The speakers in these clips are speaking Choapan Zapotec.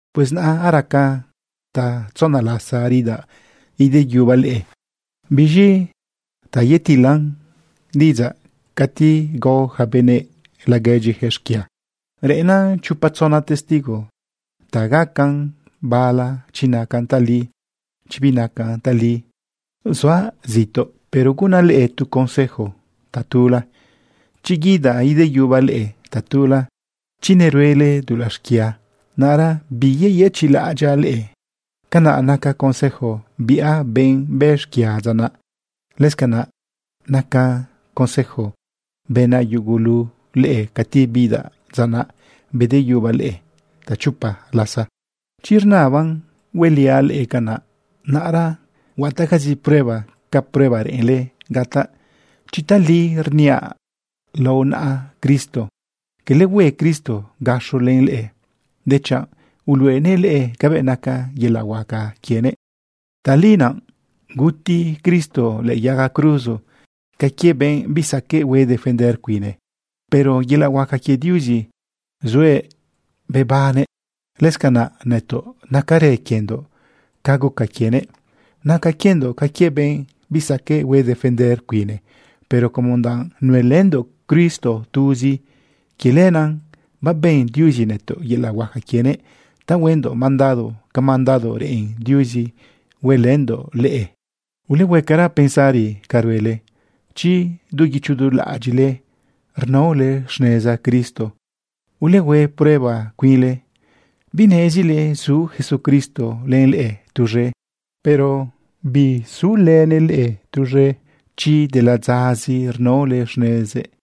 Pues naꞌ araca tatzona lasa ridaꞌ ideyubaꞌ leꞌe. Biz̃i ta yetilan diꞌidzaꞌ cati gao ja benëꞌ laguedyijëꞌ xquia, reꞌennan chopa tzona testigo ta gacan bala chi nacan tali, chi binacan tali. Zuaꞌ zituꞌ, pero gunaꞌ leꞌe tu consejo tatula: Chi guidaꞌ ideyubaꞌ leꞌe tatula, chi neruele dulaꞌ xquia, naꞌra biyeyëchiꞌlaꞌadyaꞌ leꞌe. Canaꞌ naca consejo biꞌa benꞌ bë xquia dza naꞌ. Lëscanaꞌ naca consejo bënaꞌ yugulule cati bidaꞌ dza naꞌ bedeyubaꞌ leꞌe tachopa lasa. Chi rnaban hueliaꞌ leꞌe canaꞌ, naꞌra huataꞌcazi prueba ca prueba reꞌenle gataꞌ chi tali rniaꞌ lao naꞌa Cristo. Cala hue Cristo gaxo len leꞌe, dechanꞌ uluꞌenëꞌ leꞌe cabëꞌ naca yelaꞌ huaca quienëꞌ. Tali naꞌ guti Cristo lëꞌë yaga cruzo ca quie benꞌ bisaqueꞌ hue defender cuine, pero yelaꞌ huaca quie Diuzi zuëꞌ bebannëꞌ. Lëscanꞌ nëtoꞌ nacarë quiendoꞌ ca guca quienëꞌ. Naca quiendoꞌ ca quie benꞌ bisaqueꞌ hue defender cuine, pero como danꞌ nuelëndoꞌ Cristo tuzi, quie lenaꞌ babën Diuzi nëtoꞌ yelaꞌ huaca quienëꞌ ta huendoꞌ mandado ca mandado reꞌen Diuzi huelëndoꞌ leꞌe. Ulehuecara pensari ca ruele chi du guicho du laꞌadyiꞌle rnaole xneza Cristo. Ulehue prueba cuinle. ¿Binezile zu Jesucristo len leꞌe tuz̃e? Pero bisulënëꞌ leꞌe tuz̃e chi de ladzazi rnaole xnezëꞌ.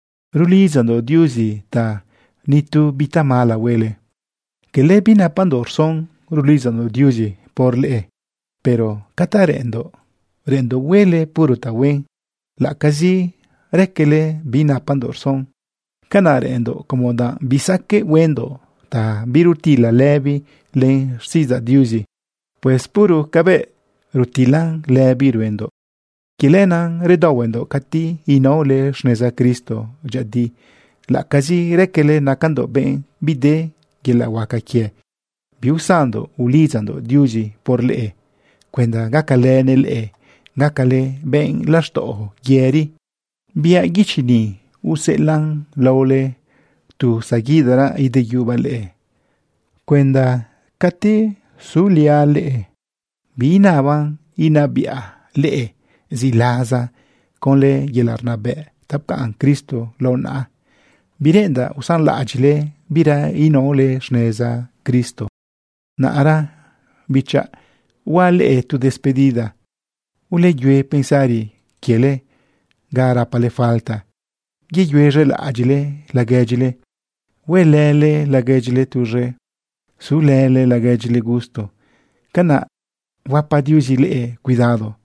Rulidzandoꞌ Diuzi ta nitu bi tamala huele. Cala binapandoꞌ rson rulidzandoꞌ Diuzi por leꞌe, pero ca ta reꞌenndoꞌ, reꞌenndoꞌ huele puro tahuen, laꞌ acazi raquele binapandoꞌ rson. Canaꞌ reꞌenndoꞌ como danꞌ bisaqueꞌ huendoꞌ ta birutila lëbi len xtiꞌidzaꞌ Diuzi. Pues puro cabëꞌ rutilan lëbi ruendoꞌ. Quie lenaꞌ redaohuendoꞌ cati inaole xneza Cristo dyëꞌëdi, laꞌacazi raquele nacandoꞌ benꞌ bide yelaꞌ huaca quie. Biusanndoꞌ ulidzandoꞌ Diuzi por leꞌe cuenda gacalënëꞌ leꞌe gacale benꞌ laxtaꞌo yëri. Biaꞌ guichi ni useꞌelaꞌn laole tu zaguidaraꞌ ideyubaꞌ leꞌe cuenda cati suliaꞌ leꞌe biinaban inabiꞌa leꞌe ziꞌlaza conlë yelaꞌ rnabëꞌ ta pcaꞌn Cristo lao naꞌa. Bireꞌendaꞌ usanlaꞌadyiꞌle bira inaole xneza Cristo. Naꞌra bichaꞌ, huaꞌ leꞌe tu despedida. Uleyue pensari quiele ga rapale falta, yeyuez̃elaꞌadyiꞌle laguedyile, huelële laguedyile tuz̃e, sulële laguedyile gusto. Canaꞌ huapa Diuzi leꞌe cuidado.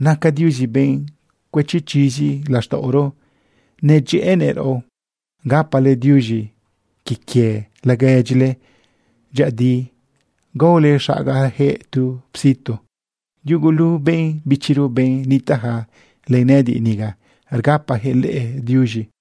Naca Diuzi benꞌ cuëchi chizi laxtaꞌoro nedyëꞌënëꞌ raꞌo. Gapale diuz̃i quie quie laguedyile dyëꞌëdi, gaole xagajëꞌ tu psitu. Yugulu benꞌ bichiro, benꞌ nitaꞌja len nëꞌëdiꞌ niga, rgapajëꞌ leꞌe diuz̃i.